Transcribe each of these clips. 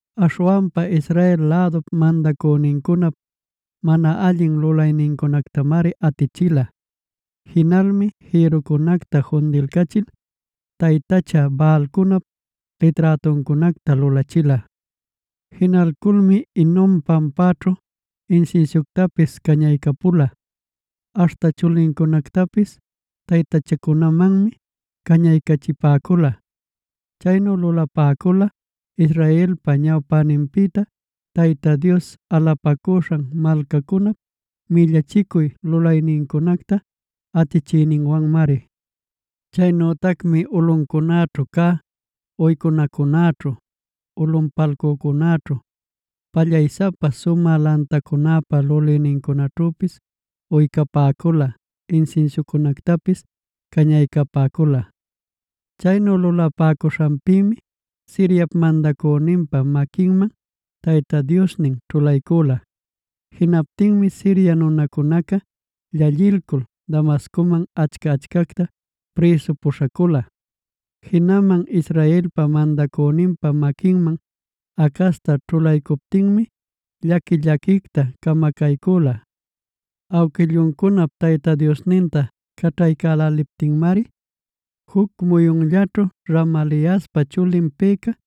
Aśhwanpa Israel lädup mandänincunap mana allin lulaynincunactamari atichila. Jinalmi jïrrucunacta fundiycachil taytacha Baalcunap liträtuncunacta lulachila. Jinalculmi Hinom pampaćhu insinsiuctapis cañaycapula; aśhta chulincunactapis taytachamanmi cañaycachipäcula. Chaynu lulapäcula Israelpa ñawpäninpïta Tayta Dios alapacuśhan malcacunap millachicuy lulaynincunacta atichïninwanmari. Chaynütacmi ulꞌucunäćhu cä uycunacunäćhu, ulꞌunpalcücunäćhu, pallaysapa sumä lantacunäpa lulïnincunaćhüpis uycapäcula, insinsiucunactapis cañaycapäcula. Chaynu lulapäcuśhanpïmi Siriap mandacüninpä maquinman Tayta Diosnin ćhulaycüla. Jinaptinmi Siria nunacunaca llallilcul Damascuman achca-achcacta prïsu puśhacula. Jinaman Israelpa mandacüninpa maquinman Acazta ćhulaycuptinmi, llaqui-llaquicta camacaycüla. Awquilluncunap Tayta Diosninta caćhaycäläliptinmari juc muyunllaćhu Remaliaspa chulin Peka,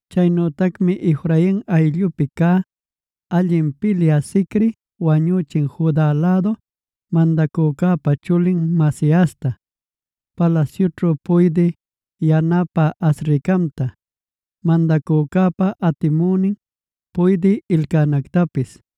Chaynütacmi Efrain ayllupi cä allin pilyä Zicri wañüchin: Juda lädu mandacücäpa chulin Maasiasta, palasyućhu puydï yanapä Azricamta, mandacücäpa atimünin puydï Elcanactapis.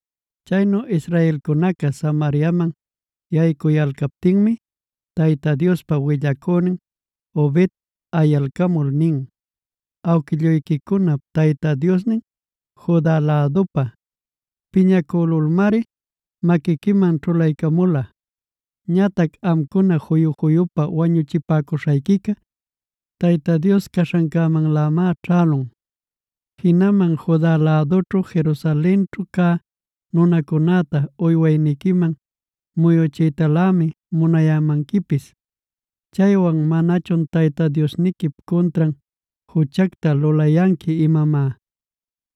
Chaynu israelcunaca Samariaman yaycuyalcaptinmi, Tayta Diospa willacünin Obed yalalcamul nin: “Awquilluyquicunap Tayta Diosnin Juda lädupa piñacülulmari maquiquiman ćhulaycamula. Ñatac amcuna juyu-juyupa wañuchipäcuśhayquica, Tayta Dios caśhancämanlämá ćhälun. Jinaman Juda lädućhu Jerusalenćhu cä nunacunäta uywayniquiman muyuchiytalämi munayanquipis. Chaywan ¿manachun Tayta Diosniquip cuntran juchacta lulayanqui imamá?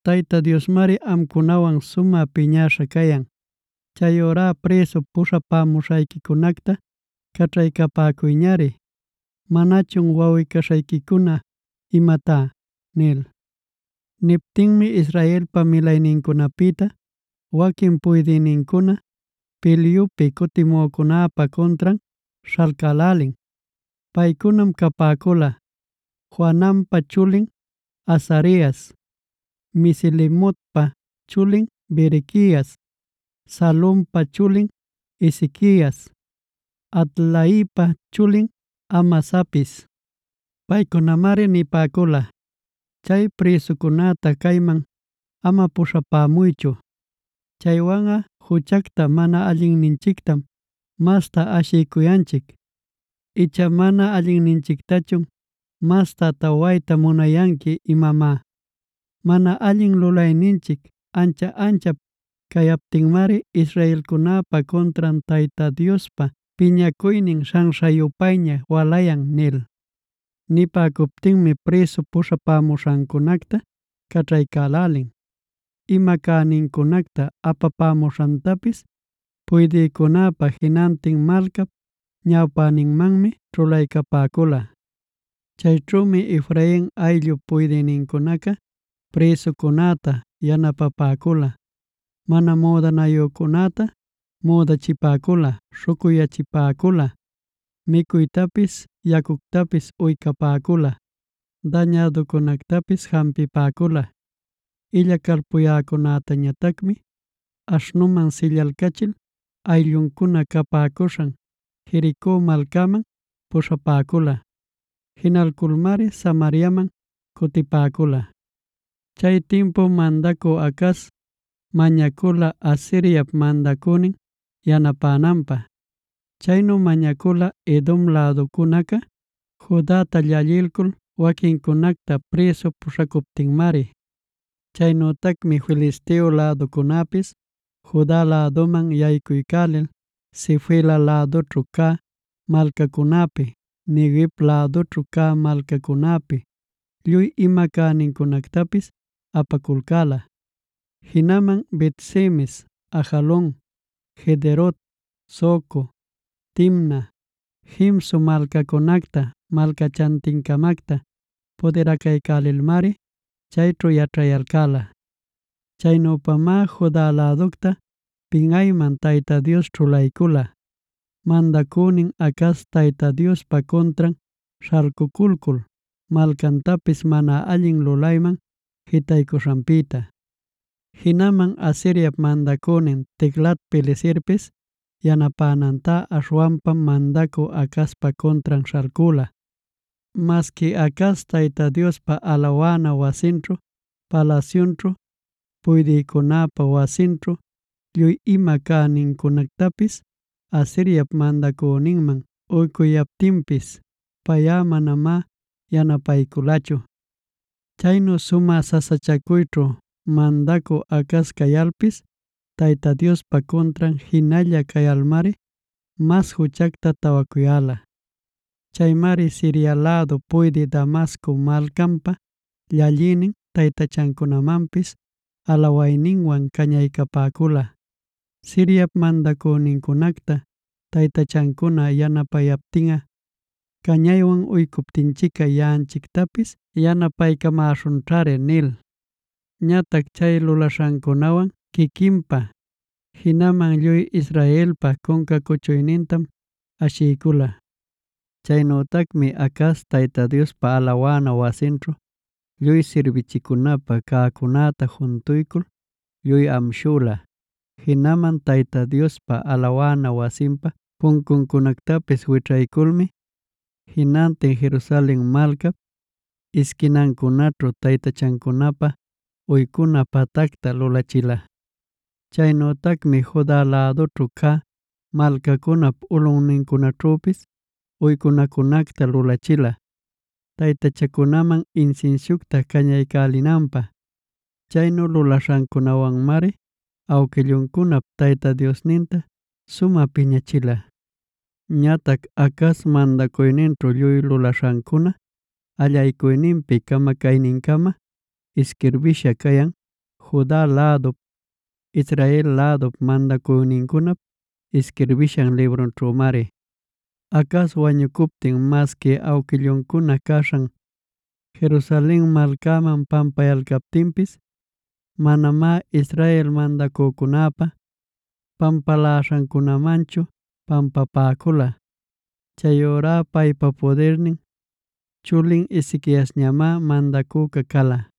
Tayta Diosmari amcunawan sumä piñäśha cayan. Chayurá prïsu puśhapämuśhayquicunacta caćhaycapäcuyñari. ¿Manachun wawꞌi-caśhayquicuna imatá?” nil. Niptinmi Israelpab milaynincunapïta waquin puydïnincuna pilyupi cutimücunäpä cuntran śhalcälälin. Paycunam capäcula: Johananpa chulin Azarias, Mesilemotpa chulin Berequias, Salumpa chulin Ezequias, Hadlaipa chulin Amasapis. Paycunamari nipäcula: “Chay prïsucunäta cayman ama puśhapämuychu. Chaywanꞌa juchacta mana allinninchictam masta ashicuyanchic; icha ¿mana allinninchictachun masta tawayta munayanqui imamá? Mana allin lulayninchic ancha-anchap cayaptinmari israelcunäpa cuntran Tayta Diospa piñacuynin śhanśha-yupayña walayan” nil. Nipäcuptinmi prïsu puśhapämuśhancunacta caćhaycälälin; ima cänincunacta apapämuśhantapis puydïcunäpa jinantin malcap ñawpäninmanmi ćhulaycapäcula. Chayćhümi Efrain ayllup puydïnincunaca prïsucunäta yanapaycapäcula: mana müdanayücunäta müdachipäcula, śhucuyyachipäcula, micuytapis yacuctapis uycapäcula, dañäduncunactapis jampiycapäcula. Illacalpuyäcunätañatacmi aśhnuman sillalcachil aylluncuna capäcuśhan Jerico malcaman puśhapäcula. Jinalculmari Samariaman cutipäcula. Chay timpum mandacü Acaz mañacula Asiriap mandacünin yanapänanpä. Chaynu mañacula Edom läducunaca Judata llallilcul waquincunacta prïsu puśhacuptinmari. Chaynütacmi Filisteo läducunäpis Juda läduman yaycuycul Sefela lädućhu cä malcacunäpi, Neguev lädućhu cä malcacunäpi lluy ima cänincunactapis apaculcäla. Jinaman Bet-semes, Ajalon, Gederot, Soco, Timna, Gimzo malcacunacta malcachantin-camacta pudiracaycälilmari chayćhu yaćhayalcäla. Chaynüpamá Juda läducta pinꞌayman Tayta Dios ćhulaycula, mandacünin Acaz Tayta Diospa cuntran śhalcuculcul malcantapis mana allin lulayman jitaycuśhanpïta. Jinaman Asiriap mandacünin Tiglat-pileserpis yanapänantá, aśhwanpam mandacü Acazpa cuntran śhalcüla. Masqui Acaz, Tayta Diospa alawana wasinćhu, palasyunćhu, puydïcunäpa wasinćhu lluy ima cänincunactapis Asiriap mandacüninman uycuyaptinpis, payꞌa manamá yanapayculachu. Chaynu sumä sasachacuyćhu mandacü Acaz cayalpis Tayta Diospa cuntran jinalla cayalmari mas juchacta tawacuyäla. Chaymari Siria lädup puydï Damasco malcanpa llallïnin taytachancunamanpis alawayninwan cañaycapäcula: “Siriap mandacünincunacta taytachancuna yanapayaptinꞌa, cañaywan uycuptinchicꞌa yaꞌanchictapis yanapaycamäśhunćhari” nil. Ñatac chay lulaśhancunawan quiquinpä, jinaman lluy Israelpa cunca cuchuynintam ashicüla. Chaynütacmi Acaz, Tayta Diospa alawana wasinćhu lluy sirbichicunapä cäcunäta juntuycul lluy amshüla. Jinaman Tayta Diospa alawana wasinpa puncuncunactapis wićhayculmi, jinantin Jerusalen malcap isquinancunaćhu taytachacunapä uycuna patacta lulachila. Chaynütacmi Juda lädućhu cä malcacunap ulꞌuncunaćhüpis uycunacunacta lulachila taytachacunaman insinsiucta cañaycälinanpä. Chaynu lulaśhancunawanmari awquilluncunap Tayta Diosninta sumä piñachila. Ñatac Acaz mandacuyninćhu lluy lulaśhancuna allaycuyninpi camacaynincama isquirbïsha cayan Juda lädup, Israel lädup mandacünincunap isquirbishan librunćhümari. Acaz wañucuptinc masqui awquilluncuna caśhan Jerusalen malcaman pampayalcaptinpis, manamá Israel mandacücunäpa pampaläśhancunämanchu pampapäcula. Chayurá paypa pudirnin chulin Ezequiasñamá mandacüca cala.